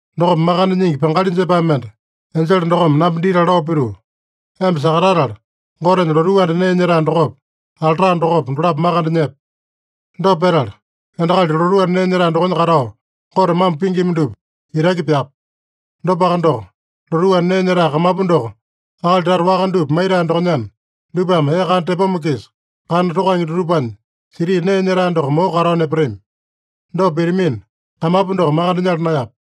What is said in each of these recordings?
Dokopa makande nyingi pangali jepae mende enjele dokome namba ditala lao pituu, “Emba sakatatala, Gotenya lotuu anda nee nyetae dokopa, alta dokopa, dolapo makande nyepe. Dopa petala, endakali lotuu anda nee nyetae dokonya katao, Gote mambo pingima dupa itaki pyape. Dopaka doko, lotuu anda nee nyetae kamapu doko akali tata waka dupa maitae dokonyana, dupame ee kana tepoma-kisa kana tokange dutupanya siti nee nyetae doko moko katao nepatami. Dopa pitamina, kamapu doko makande nyala naeyape.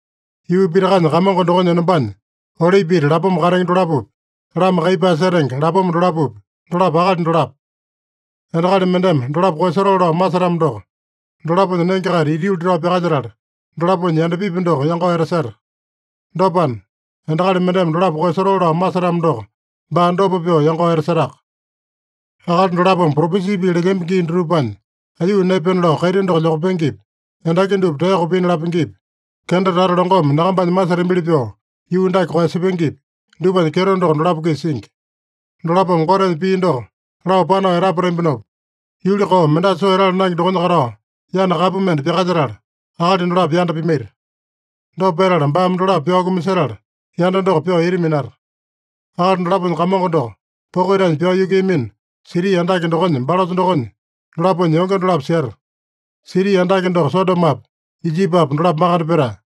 Yuu pitakanya Kamongo dokonya enombanya olipi ita lapoma katenge dolapopi, lama kaiyepae setenge lapoma dolapopi, dolapo akali dolapo. Endakali mendeme dolapo koeyasotoo lao masetamo doko, dolaponya nenge-kaita ita yuli tao pyakalyetala, dolaponya yandapipi doko yangao etaseta. Dopana, endakali mendeme dolapo koeyasotoo lao masetamo doko, baa dopa pyoo yangao etasetaka. Akali dolapome propesi pii lelyambi gii dutupanya aiyuu naepena lao kaiti doko lyokapengepi, endaki dupa taeyoko pina lapengepi, kenda tata longome nyakambanya masetambili pyoo yuu dake koeyasepengepi, dupanya kyeto doko dolapo-kisa singi. Dolapome Gotenya pii doko lao panao etapatambinopa, yuli koo, mendasa soo etala naenge dokonya katao yana kapu mende pyakalyetala, akali dolapo yanda pimaita. Dopa petala baame dolapo pyao kumasetala, yanda doko pyoo ita minata. Akali dolaponya Kamongo doko poko itanya pyao yukuiyamino, siti andake dokonya balosa dokonya dolaponya yonge dolapo seta. Siti andake doko Sodomopa, Ijipipa dolapo makande petae.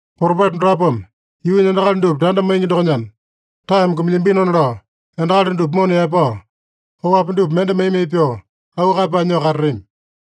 Propeta dolapome yuunya endakali dupa tanda maingi dokonyana, taeme kumilyambinona lao, endakali dupa mona yaepao, oapi dupa mende mai-mai pyoo, auu kaeyapae nyoo katatami.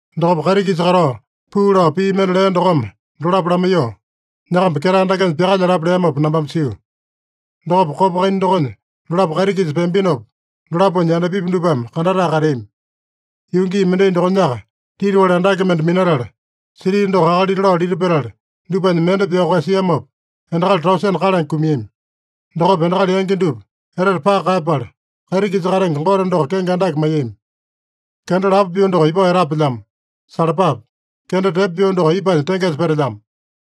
Dokopa kaiti-kisa katao puu lao pii mende lea dokome dolapo lamaiyoo, “Nyakamba ketae dakenya pyakalyalapa” leamopa nambame sio. Dokopa kopa kaina dokonya dolapo kaiti-kisa peambinopa, dolaponya yandapipi dupame kandatae kateami. Yuu gii mendai dokonyaka titiwali andake mende minatala, siti doko akalita lao lita petala, dupanya mende pyao koeyasiamopa, endakali tausene kalange kumiami. Dokopa endakali yangi dupa etete paka kaeyapala, kaiti-kisa katenge Gote doko kenge andake maiyami. Kenda lapo pyoo doko ipao etapelyamo. Salapape! Kenda tepo pyoo doko ipanya tengesa petelyamo.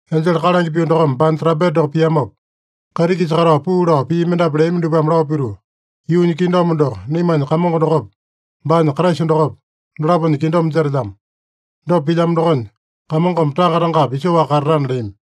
Enjele kalange pyoo dokome baanya trampeta doko piamopa, kaiti-kisa katao puu lao pii mendapu leami dupame lao pituu, “Yuunya kingdom doko naimanya Kamongo dokopa, baanya Kraisa dokopa, dolaponya kingdom jetelyamo. Dopa pilyamo dokonya, Kamongome tanga-tangapi isoaka katatana” leami.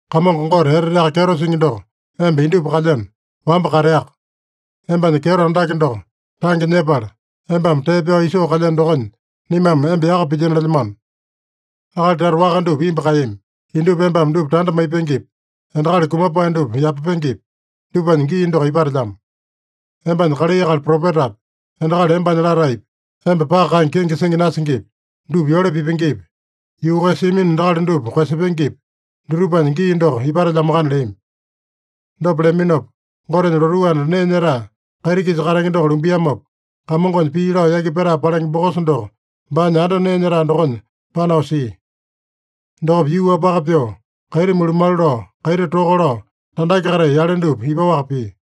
“Kamongo Gote Eteteaka Kyeto Singi doko, emba indupa kalyeno, wamba kateaka. Embanya kyeto andake doko tange nyepala, embame tee pyao isoo kalyeno dokonya, naimame emba yaka pilyino lelyamano. Akali tata waka dupa imbu kaeyami. Indupa embame dupa tanda maipengepi, endakali kumapae dupa yapapengepi, dupanya gii doko ipatelyamo. Embanya kalai akali propetapi, endakali embanya lataepi, emba paka kaenge kenge singi nasingipi, dupa yole pipengepi, yuu koeyasiamino endakali dupa koeyasepengepi, dutupanya gii doko ipatelyamoakana” leami. Dopa leaminopa, Gotenya lotuu anda nee nyetae kaiti-kisa katenge doko lumbiamopa, Kamongonya pii lao yaki petae palenge bokosa doko baanya anda nee nyetae dokonya panao sia. Dokopa yuu-wapaka pyoo, kaiti mulumalu lao, kaiti toka lao, tandake-katai yale dupa ipaowaka pia.